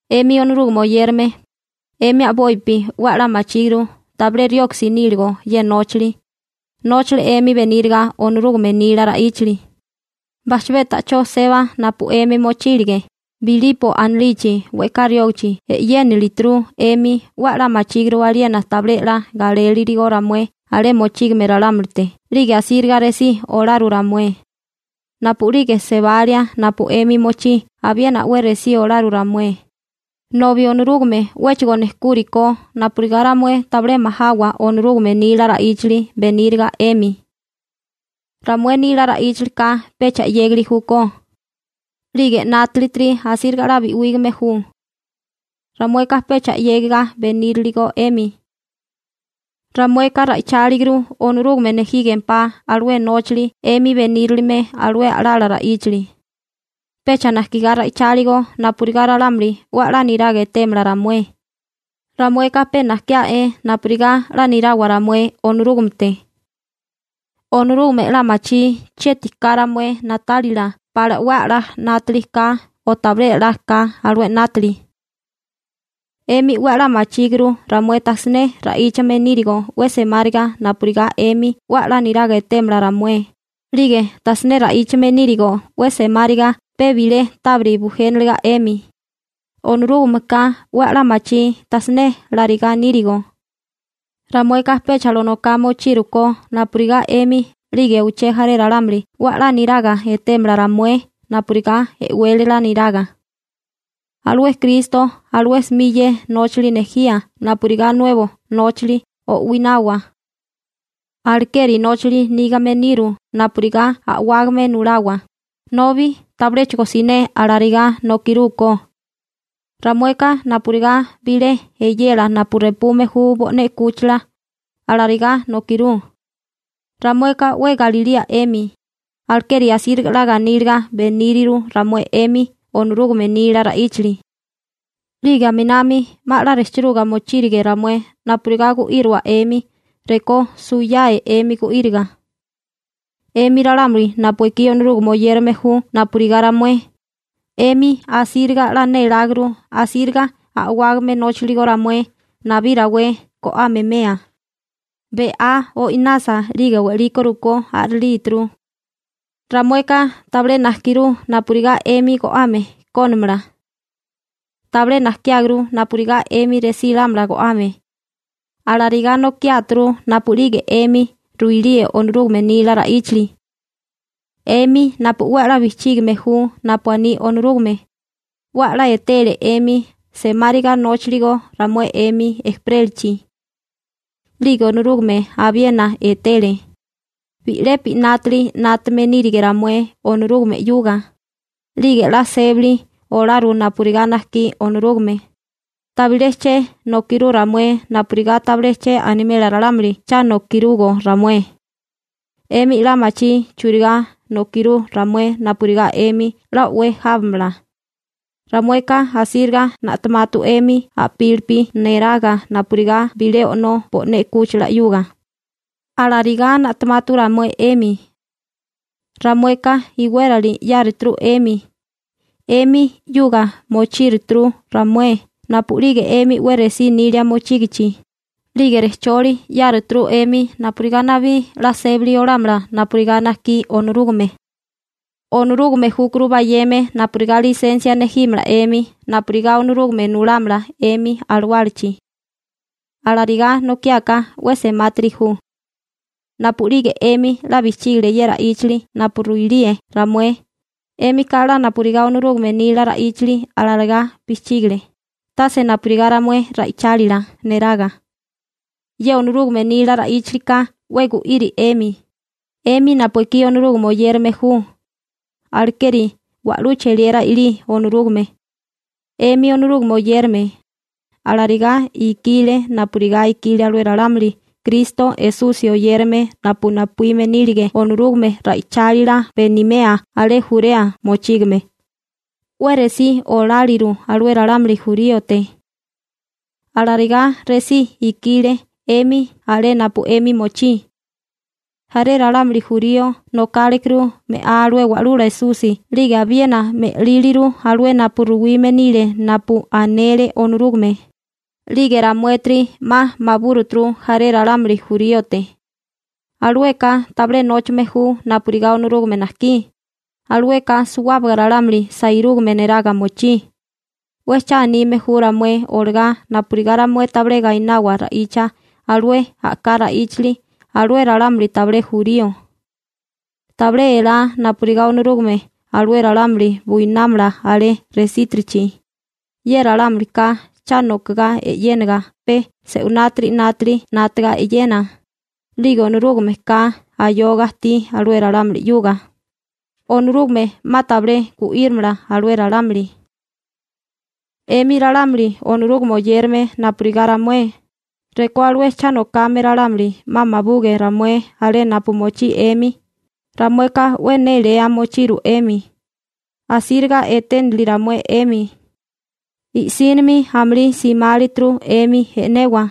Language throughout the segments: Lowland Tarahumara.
'Emi Onorúgame oyérame, 'emi a'bopi 'we a'lá machíguru tabilé rioksi níligo ye nóchali, nóchale 'emi beníriga Onorúgame nila ra'íchali. Bajchabé ta'chó seba napu 'emi mochílige, Bilipo anilichi we'ká riógachi e'yénilituru 'emi 'we a'lá machíguru aliena tabilé 'la galélirigo ramué alé mochígame ralámulite 'lige asíriga resí olaru ramué. Napu'lige sebalia napu 'emi mochí abiena 'we resí olaru ramué, nobi Onorúgame 'wéchigo nejkúrikó napurigá ramué tabilé majawa Onorúgame nila ra'íchali beníriga 'emi. Ramué nila ra'íchalika pecha 'yégali júkó, 'lige 'nátalitiri asíriga 'la bi'wígame ju. Ramueka pecha 'yégiga beníriligo 'emi. Ramueka ra'icháliguru Onorúgame nejígempá alué nóchali 'emi benírilime alué a'lala ra'íchali. Pecha najkigá ra'icháligo napurigá ralámuli 'we a'lá niraga etémala ramué, ramueka pe najkiá'é napurigá 'la nirawa ramué Onorúgamete. Onorúgame 'la machí chieti ka ramué na'tálila pala 'we a'lá 'nátili ka o tabilé 'la ka alué 'nátili. 'Emi 'we a'lá machíguru ramué tajsiné ra'íchame nírigo 'we semáriga napurigá 'emi 'we a'lá niraga etémala ramué, 'lige tajsiné ra'íchame nírigo 'we semáriga pe bilé tábiri bujéniliga 'emi. Onorúgameka 'we a'lá machí tajsiné larigá nírigo. Ramueka pecha lonoká mochírukó napurigá 'emi 'lige uché jaré ralámuli 'we a'lá niraga etémala ramué napurigá e'wélala niraga. Alué Kristo alué 'smi ye nóchali nejía napurigá nuebo nóchali o'winawa. Alekeri nóchali nígame niru napurigá a'wágame nulawa, nobi tabiléchigo siné alarigá nokirúkó. Ramueka napurigá bilé eyela napu repume ju bo'né 'kúchila, alarigá nokirú. Ramueka 'we galilía 'emi, alekeri asíriga 'la ganíliga beníriru ramué 'emi Onorúgame nila ra'íchali. 'Lige aminami 'ma 'la 'nátaga mochírige ramué napurigá gu'írowa 'emi rekó suwiyae 'emi gu'íriga. 'Emi ralámuli napu ekí Onorúgame oyérame ju napurigá ramué, 'emi asíriga 'la néláguru asíriga a'wágame nóchaligo ramué nabí rawé go'ame 'mea, be'á o'inasa 'lige we'liko rukó a'rilíturu. Ramueka tabilé najkirú napurigá 'emi go'ame kónimala. Tabilé najkiáguru napurigá 'emi resí lámala go'ame. Alarigá nokiáturu napu'lige 'emi ruilíe Onorúgame nila ra'íchali. 'Emi napu 'we a'lá bijchígame ju napu aní Onorúgame, 'we a'lá etele 'emi semáriga nóchiligo ramué 'emi ejperélichi. 'Lige Onorúgame abiena etele. Bi'lepi 'nátili 'nátame nírige ramué Onorúgame 'yuga. 'Lige 'la sébali olaru napurigá najkí Onorúgame. Tabilé che nokirú ramué napurigá tabilé che animela ralámuli cha nokirugo ramué. 'Emi 'la machí churigá nokirú ramué napurigá 'emi 'la o'wé jábamala. Ramueka asíriga na'tamatu 'emi a'pílipi neraga napurigá bilé o'nó bo'né 'kúchila 'yuga, alarigá na'tamatu ramué 'emi. Ramueka iwérali 'yáruturu 'emi. 'Emi 'yuga mochíruturu ramué napu'lige 'emi 'we resí nilia mochígichi, 'lige rejcholi 'yáruturu 'emi napurigá nabí 'la sébali olámala napurigá najkí Onorúgame. Onorúgame júkuru bayeme napurigá lisensia nejímala 'emi napurigá Onorúgame nulámala 'emi alawálachi. Alarigá nokiáká 'we semátiri ju. Napu'lige 'emi 'la bijchígile ye ra'íchili napu ruilíe ramué, 'émika 'la napurigá Onorúgame nila ra'íchali alarigá bijchígile, tase napurigá ramué ra'ichálila neraga. Ye Onorúgame nila ra'íchalika 'we gu'iri 'emi, 'emi napu ekí Onorúgame oyérame ju. Alekeri wa'lú cheliera i'lí Onorúgame. 'Emi Onorúgame oyérame, alarigá ikile napurigá ikile alué ralámuli Kristo Esusi oyérame napu napuíme nílige Onorúgame ra'ichálila benimea alé Jurea mochígame. 'We resí oláliru alué ralámuli juríote. Alarigá resí ikile 'emi alé napu 'emi mochí. Jaré ralámuli jurío nokálekuru me'á alué Wa'lula Esusi 'lige abiena me'líliru alué napu ruwime nile napu anele Onorúgame, 'lige ramuétiri 'ma mabúruturu jaré ralámuli juríote. Alueka tabilé nóchame ju napurigá Onorúgame najkí. Alueka suwábaga ralámuli sairúgame neraga mochí. 'We cha anime ju ramué olagá napurigá ramué tabilé gainawa ra'icha alué a'ká ra'íchali alué ralámuli tabilé jurío. Tabilé elá napurigá Onorúgame alué ralámuli buinámala alé resítirichi. Ye ralámulika cha nokigá e'yéniga pe se'winátiri 'nátili 'nátaga e'yena. 'Lige Onorúgameka ayoga ajtí alué ralámuli 'yuga, Onorúgame 'ma tabilé gu'írimala alué ralámuli. 'Emi ralámuli Onorúgame oyérame napurigá ramué, rekó alué cha nokame ralámuli 'ma mabuge ramué alé napu mochí 'emi, ramueka 'we néléa mochiru 'emi. Asíriga eténili ramué 'emi. I'sínimi amulí simálituru 'emi e'newa.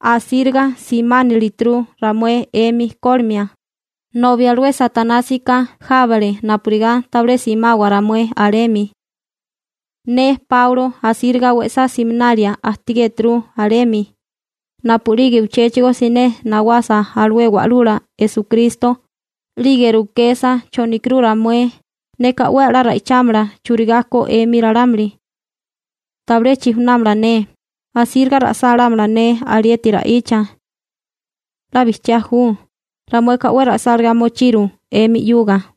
Asíriga simánilituru ramué 'emi kólimia, nobi alué Satanásika jábale napurigá tabilé simawa ramué alemi. Ne Páulo asíriga we'sá siminalia ajtigéturu alemi. Napu'lige uchéchigo siné nawasa alué Wa'lula Esukristo, 'lige rukesa chonikirú ramué, neka 'we a'lá ra'ichámala churigá ko 'emi ralámuli. Tabilé chijunámala ne. Asíriga ra'sálámala ne alieti ra'icha. 'La bijchiá ju, ramueka 'we ra'sálagá mochiru 'emi 'yuga.